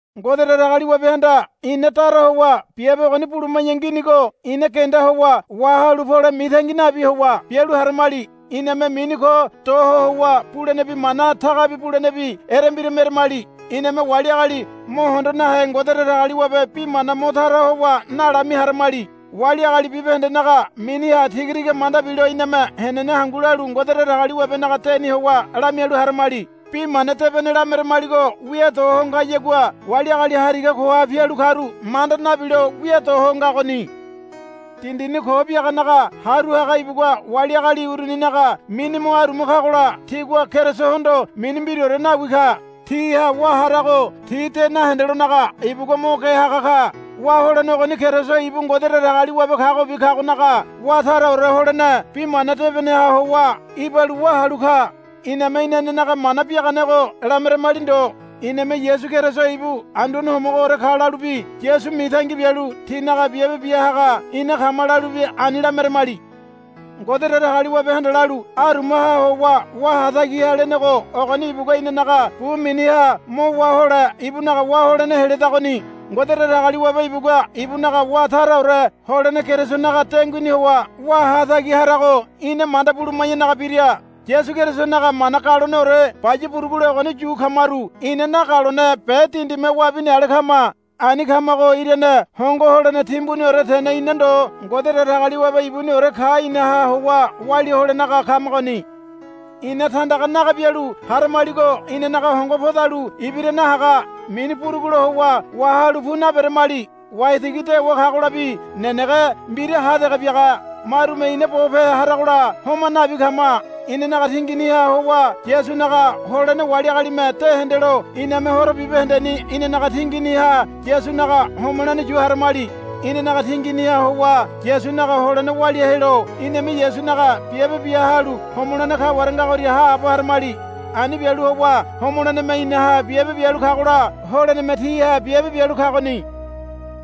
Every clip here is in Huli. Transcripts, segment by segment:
Ngode Datagaliwabehanda ina dara howa biabe ogoni buluma̱ya nginigo ina genda howa wahalu pole mitangi nabi howa bialu haramali. Iname mini ko do howa bulenebi mana tagabi bulenebi erembira meremali. Iname wali agali mo hondo nahe Ngode Datagaliwabe bi mana mo tara howa nalami haramali. Wali agali bibahendenaga miniha tiga tiga manda bilo iname henene hangu lalu Ngode Datagaliwabenaga deni howa lamialu haramali. Bi mana debene lameramaligo wia do ho ngayagua wali agali hariga koha pialu karu manda nabilo wia do ho ngagoni. Dindini ko biaganaga haru haga ibugua wali agali uruninaga mini mo aruma kagola tigua Kerisohondo mini mbiraore nawi ka. Tiha wá harago ti de nahendelonaga ibugua mo ge haga ka. Wá holene ogoni Keriso ibu Ngode Datagaliwabe kagobi kagonaga wá taraore holene Bi Mana Debeneha howa ibalu wá halu ka. Iname inanenaga mana biaganego lameremali ndo. Iname Yasu Keriso ibu Anduane Homogoore ka lalubi Yasu mitangi bialu tínaga biabe bia haga ina kama lalubi ani lameremali. Ngode Datagaliwabehanda lalu, Arumaha howa wá hatagi ha, lenego ogoni ibugua inanaga bu miniha mo wá hole ibunaga wá holene heledagoni. Ngode Datagaliwabe ibugua ibunaga wá taraore holene Kerisonaga denguini howa wá hatagi harago ina manda buluma̱yanaga bira. Yasu Kerisonaga mana galoneore baya burugule ogoni yu kamaru ina nagalone be dindime wabini ale kama. Ani kamago irane hongo holene timbuniore tene ina ndo Ngode Datagaliwabe ibuniore ka inaha howa walia holenaga kamagoni. Ina tandaga naga bialu haramaligo inanaga hongo podalu ibira nahaga. Mini burugulo howa wahalu pu naberamali. Waitigi dewa kagolabi nenege mbira ha dege biaga. Marume ina bope haragola homa nabi kama. Inanaga tinginiha howa Yasunaga holene wali agalime de hendelo iname horo bibahendeni inanaga tinginiha Yasunaga homolene yu haramali. Inanaga tinginiha howa Yasunaga holene walia helo iname Yasunaga biabe bia halu homolene kaware ngagoria haabo haramali. Ani bialu howa homoleneme inaha biabe bialu kagola holeneme tíha biabe bialu kagoni.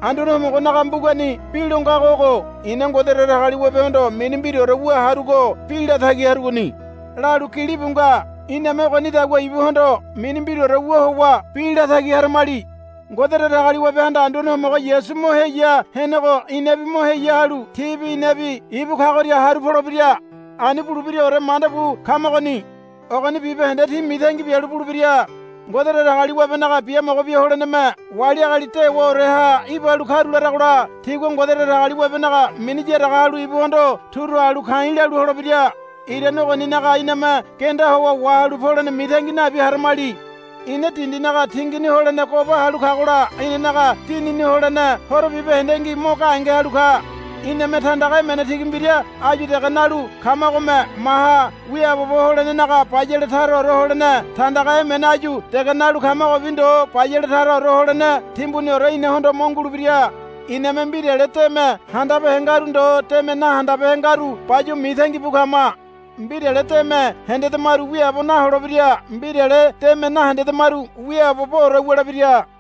Anduane Homogonaga mbugani bi lo ngago ogo, I̱na Ngode Datagaliwabehondo mini mbiraore wu harugo bi latagi harugoni, lalu gilibu nga. Iname ogonidagua ibuhondo mini mbiraore wu howa bi latagi haramali. Ngode Datagaliwabehanda Anduane Homogo Yasu mo heya henego inabi mo heya halu tíbi inabi ibu kagoria haru polebira. Ani bulebiraore manda bu kamagoni. Ogoni bibahende tí mitangi bialu bulebira. Ngode Datagaliwabenaga biamogo bia holeneme wali agali dewaoreha ibalu karularagola tigua Ngode Datagaliwabenaga mini yaraga halu ibuhondo turu halu ka̱i̱ lalu holebira. Irane ogoninaga iname genda howa wahalu polene mitangi nabi haramali. Ina dindinaga tingini holene goba halu kagola inanaga dinini holene horo bibahendengi mo gahenge halu ka. Iname tandaga emene tigi mbira áyu dege nalu kamagome maha wiaabobo holenaga bayale taraore holene tandaga emene áyu dege nalu kamagobi ndo bayale taraore holene timbuniore inahondo mo ngulebira. Iname mbirale deme handabehe ngaru ndo deme nahandabehe ngaru bayuwa mitangi bu kama. Mbirale deme hendedamaru wiaabo naholebira mbirale deme nahendedamaru wiaaboboore wulebira.